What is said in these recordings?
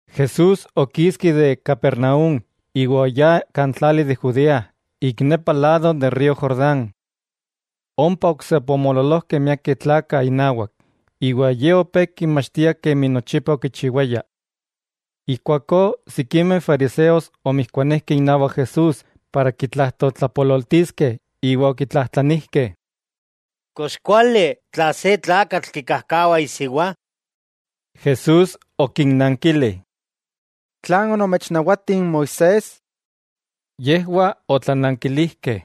Jesús okiski de Capernaúm iwa oyá kan tlali de Judea ik nepa lado de n río Jordán. Ompa oksepa omoololojkeh miakeh tlakah inawak, iwa Ye opé kinmachtia kemi nochipa okichiwaya. Ijkuakó sikimeh fariseos omijkuanijkeh inawak Jesús para kitlajtoltlapololtiskeh iwa okitlajtlanijkeh: —¿Kox kuali tla se tlakatl kikajkawa isiwa? Jesús okinnankili: —¿Tlan onomechnawati n Moisés? Yejwah otlanankilijkeh: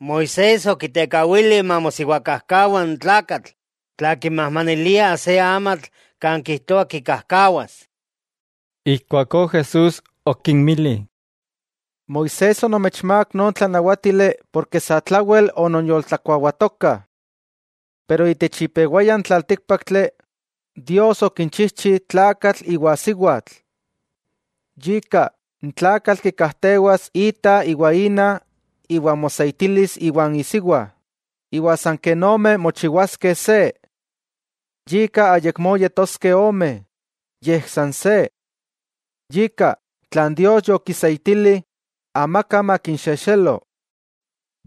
—Moisés okitekawili mamosiwakajkawa n tlakatl tla kimajmanilia se amatl kan kijtoa kikajkawas. Ijkuakó Jesús okinmili: —Moisés onomechmák non tlanawátili porke satlawel ononyoltlakuawatokah. Pero itech ipewaya n tlaltíkpaktli, Dios okinchijchi “tlakatl iwa siwatl”. “Yika n tlakatl kikajtewas ita iwa ina iwa moseitilis iwan isiwa, iwa san ken ome mochiwaskeh se.” Yika ayakmó yetoskeh ome, yej san se. Yika, tlan Dios yokiseitili, amaka makinxexelo.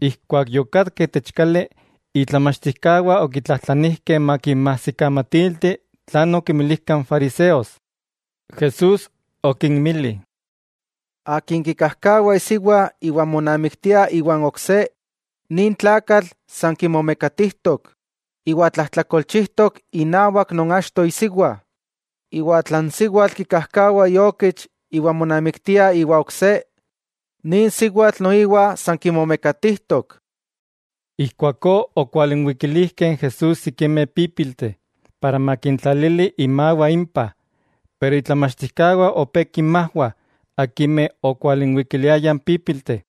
Ijkuak yokatkah itech kali, itlamachtijkawah okitlajtlanilijkeh makinmajsikamatilti tlan okimilijka n fariseos. Jesús okinmili: —Akin kikajkawa isiwa iwa monamiktia iwan ok se, nin tlakatl san kimomekatijtok iwa tlajtlakolchijtok inawak non achto isiwa, iwa tla n siwatl kikajkawa iokich iwa monamiktia iwa ok se, nin siwatl noiwa san momekatijtok. Ijkuakó okwalinwikilijkeh n Jesús sikimeh pípilteh, para makintlalili imawah impah, pero itlamachtijkawah opé kinmajwah akimeh okwalinwikiliayah n pípilteh.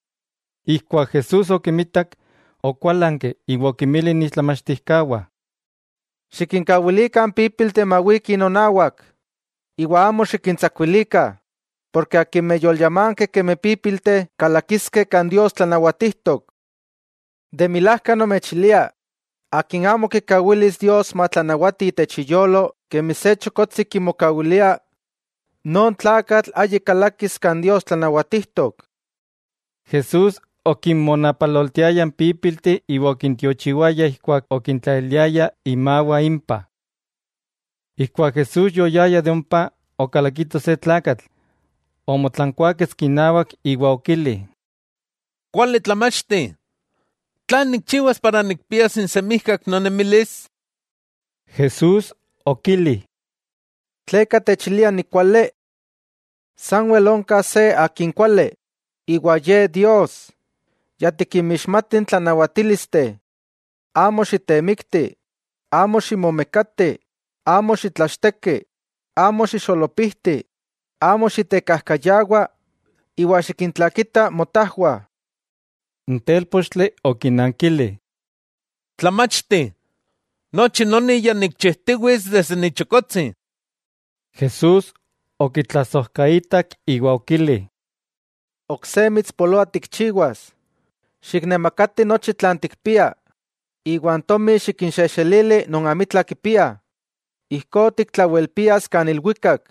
Ijkuak Jesús okimitak, okuálanki iwa okinmili itlamachtijkawah: —Xikinkawilikah n pípilteh mawikih nonawak, iwa amo xikintsakuilikah, porke akimeh yolyamankeh kemi pípilteh kalakiskeh kan Dios tlanawatijtok. De milajka nomechilia, akin amo kikawilis Dios matlanawati itech iyolo kemi se chokotsi kimokawilia, non tlakatl ayik kalakis kan Dios tlanawatijtok. Jesús okinmonapaloltiaya n pípilteh iwa okintiochiwaya ijkuak okintlaliliaya imawah impah. Ijkuak Jesús yoyaya de ompa, okalakiko se tlakatl, omotlankuáketski inawak iwa okili: —Kuali tlamachti, ¿tlan nikchiwas para nikpias n semijkak nonemilis? Jesús okili: —¿Tleka techilia nikuali? Sanwel onka se Akin kuali, iwa Ye Dios. Ya tikinmixmati n tlanawatílisteh: “Amo xitemikti, amo ximomekati, amo xitlachteki, amo xixolopijti, amo xitekajkayawa, iwa xikintlakita motajwah.” N telpochtli okinankili: —Tlamachti, nochi noni ya nikchijtiwits desde ni telpochtli. Jesús okitlasojkaitak iwa okili: —Ok se mitspoloa tikchiwas: xiknemakati nochi tlan tikpia, iwa n tomi, xikinxejxelili non amitla kipiah, ijkó tiktlawelpias kan ilwikak,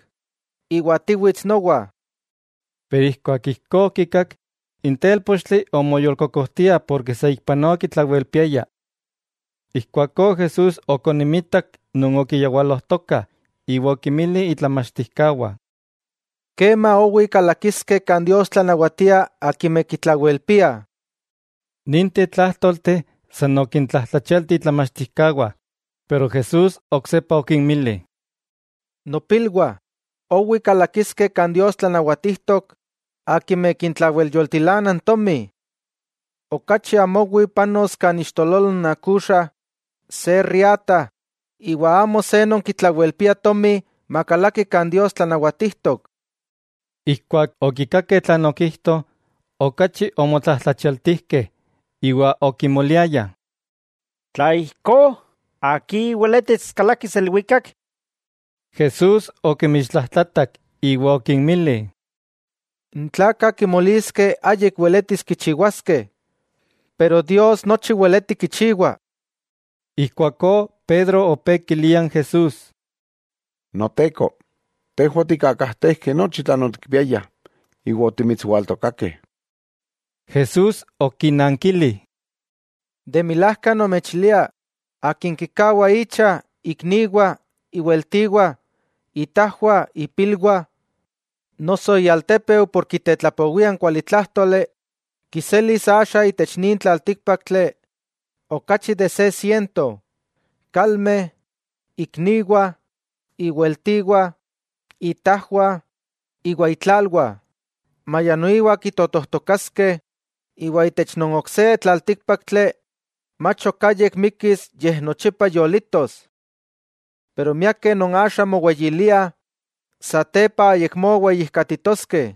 iwa tiwits nowa. Pero ijkuak ijkó okikak, n telpochtli omoyolkokojtia porke saikpanoa okitlawelpiaya. Ijkuakó Jesús okonimitak non okiyawalojtokah iwa okinmili itlamachtijkawah: —¡Kema owi kalakiskeh kan Dios tlanawatia akimeh kitlawelpiah! Ninteh tlájtolteh san okintlajtlachialti itlamachtijkawah, pero Jesús oksepa okinmili: —Nopilwah, ¡owi kalakiskeh kan Dios tlanawatijtok akimeh kintlawelyoltilana n tomi! Okachi amo owi panos kan ixtololo n akuxa se riata iwa amo se non kitlawelpia tomi makalaki kan Dios tlanawatijtok. Ijkuak okikakeh tlan okijto, okachi omotlajtlachialtijkeh iwa okimoliayah: —Tla ijkó, ¿akin weletis kalakis ilwikak? Jesús okimixtlajtlatak iwa okinmili: —N tlakah kimoliskeh ayik weletis kichiwaskeh, pero Dios nochi weleti kichiwa. Ijkuakó Pedro opé kilia n Jesús: —Noteko, tejwah otikkakajtejkeh nochi tlan otikpiayah, iwa otimitswaltokakeh. Jesús okinankili: —De milajka nomechilia, akin kikawa icha, ikniwah, iweltiwah, itajwah, ipilwah, noso ialtépeu por kitetlapowia n kualitlájtoli, kiselis axa itech nin tlaltíkpaktli okachi de se siento: kalmeh, ikniwah, iweltiwah, itajwah, iwa itlalwah, maya noiwa kitotojtokaskeh, iwa itech non ok se tlaltíkpaktli, mach ok ayik mikkis yej nochipa yolitos. Pero miakeh non axa moweyiliah, satepa ayakmó weyijkatitoskeh,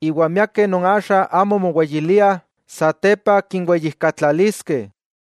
iwa miakeh non axa amo moweyiliah satepa kinweyijkatlaliskeh.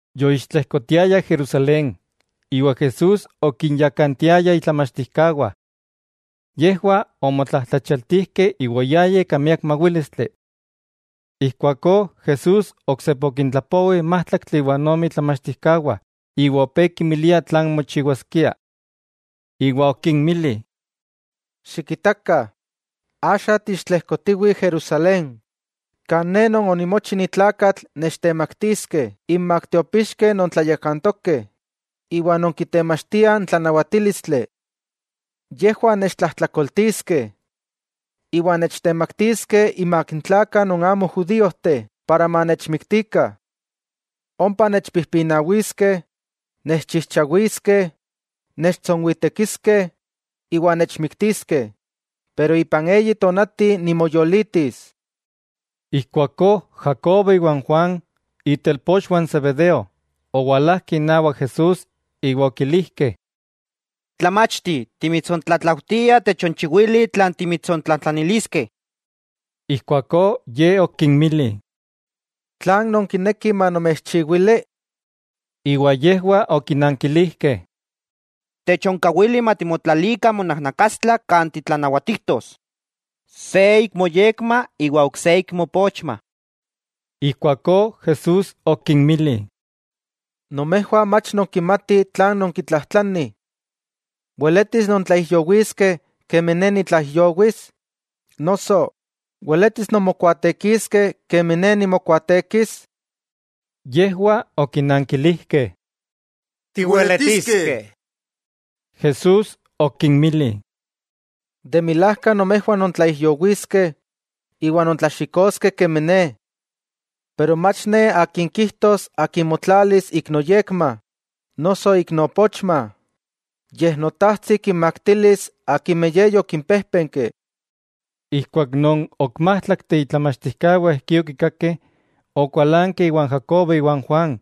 Yoixtlejkotiayah Jerusalén, iwa Jesús okinyakantiaya itlamachtijkawah. Yejwah omotlajtlachaltijkeh iwa oyayah ika miak mawílistli. Ijkuakó Jesús oksepa okintlapowi n májtlaktli iwa ome itlamachtijkawah iwa opé kinmilia tlan mochiwaskia. Iwa okinmili: —Xikitakah, axa tiixtlejkotiwih Jerusalén, kan Ne Non onimochi ni tlakatl nechtemaktiskeh inmak tiopixkeh non tlayakantokeh iwa non kitemachtiah n tlanawatílistli. Yejwah nechtlajtlakoltiskeh iwa nechtemaktiskeh inmak n tlakah non amo judíojteh para manechmiktikah. Ompa nechpijpinawiskeh, nechchijchawiskeh, nechtsonwitekiskeh iwa nechmiktiskeh, pero ipan eyi tonati nimoyolitis. Ijkuakó Jacobo iwa n Juan, itelpochwah n Zebedeo, owalajkeh inawak Jesús iwa okilijkeh: —Tlamachti, timitsontlatlaujtiah techonchiwili tlan timitsontlajtlaniliskeh. Ijkuakó Ye okinmili: —¿Tlan nonkinekih manomechchiwili? Iwa yejwah okinankilijkeh: —Techonkawili matimotlalikah monajnakastla kan titlanawatijtos, se ik moyekma iwa ok se ik moopochma. Ijkuakó Jesús okinmili: —Nomejwah mach nonkimatih tlan nonkitlajtlanih. ¿Weletis nontlaijyowiskeh kemi Ne nitlaijyowis?, noso ¿weletis nonmokuaatekiskeh kemi Ne nimokuaatekis? Yejwah okinankilijkeh: —Tiweletiskeh. Jesús okinmili: —De milajka nomejwah nontlaijyowiskeh iwa nontlaxikoskeh kemi Ne. Pero mach Ne Akin kijtos akin motlalis ik noyekma noso ik noopochma, yej Notajtsi kinmaktilis akimeh Ye yokimpéjpenki. Ijkuak non ok májtlakteh itlamachtijkawah ijkí okikakeh, okualankeh iwan Jacobo iwa n Juan.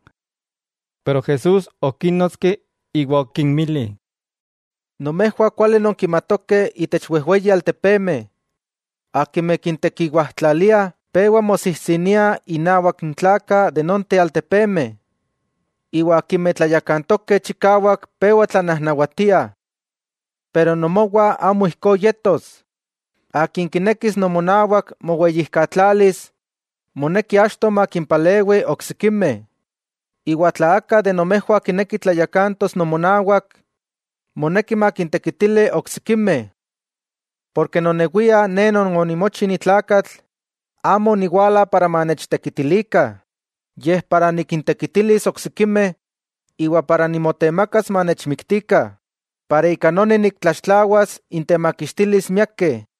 Pero Jesús okínnotski iwa okinmili: —Nomejwah kuali nonkimatokeh itech wejweyi altepemeh, akimeh kintekiwajtlaliah pewa mosijsiniah innawak n tlakah de nonteh altepemeh, iwa akimeh tlayakantokeh chikawak pewa tlanajnawatiah. Pero nomowah amo ijkó yetos. Akin kinekis nomonawak moweyijkatlalis, moneki achto makimpalewi oksikimeh, iwa tla aka de nomejwah kineki tlayakantos nomonawak, moneki makintekitili oksikimeh. Porke nonewia Ne Non onimochi ni tlakatl amo oniwala para manechtekitilikah yej para nikintekitilis oksikimeh iwa para nimotemakas manechmiktikah para ika noni niktlaxtlawas intemakixtilis miakeh.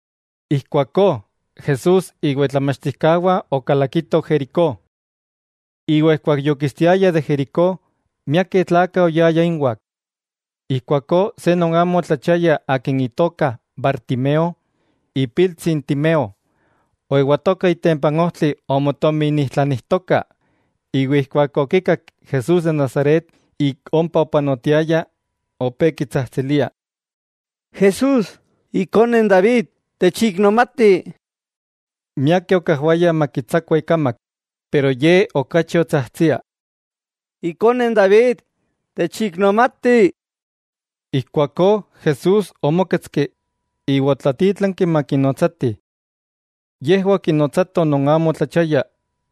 Ijkuakó Jesús iwa itlamachtijkawah okalakitoh Jericó. Iwa ijkuak yokistiayah de Jericó, miakeh tlakah oyayah inwah. Ijkuakó se non amo otlachiaya akin itoka Bartimeo, ipiltsi n Timeo, oewatoka itempa n ojtli omotominijtlanijtoka. Iwa ijkuak okikak Jesús de Nazaret ik ompa opanotiaya, opé kitsajtsilia: —¡Jesús, Ikone n David techiknomati! Miakeh okajwayah makitsakua ikamak, pero ye okachi otsajtsia: —¡Ikone n David, techiknomati! Ijkuakó Jesús omóketski, iwa otlatítlanki makinotsatih. Yejwah okinotsatoh non amo otlachiaya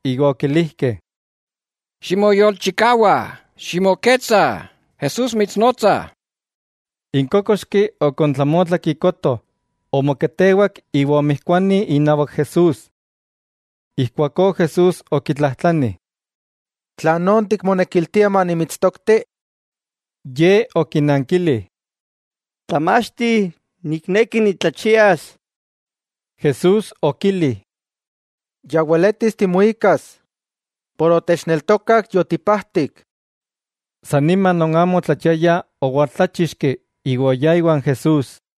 iwa okilijkeh: —¡Ximoyolchikawa! Ximoketsa. ¡Jesús mitsnotsa! N kókoxki okontlamotlak ikoto, omoketewak iwa omijkuani inawak Jesús. Ijkuakó Jesús okitlajtlani: —¿Tlan tikmonekiltia manimitstokti? Ye okinankili: —Tlamachti, nikneki nitlachias. Jesús okili: —Ya weletis timuikas, por otechneltokak yotipajtik. San nima non amo otlachiaya owaltláchixki iwa oyá iwan Jesús.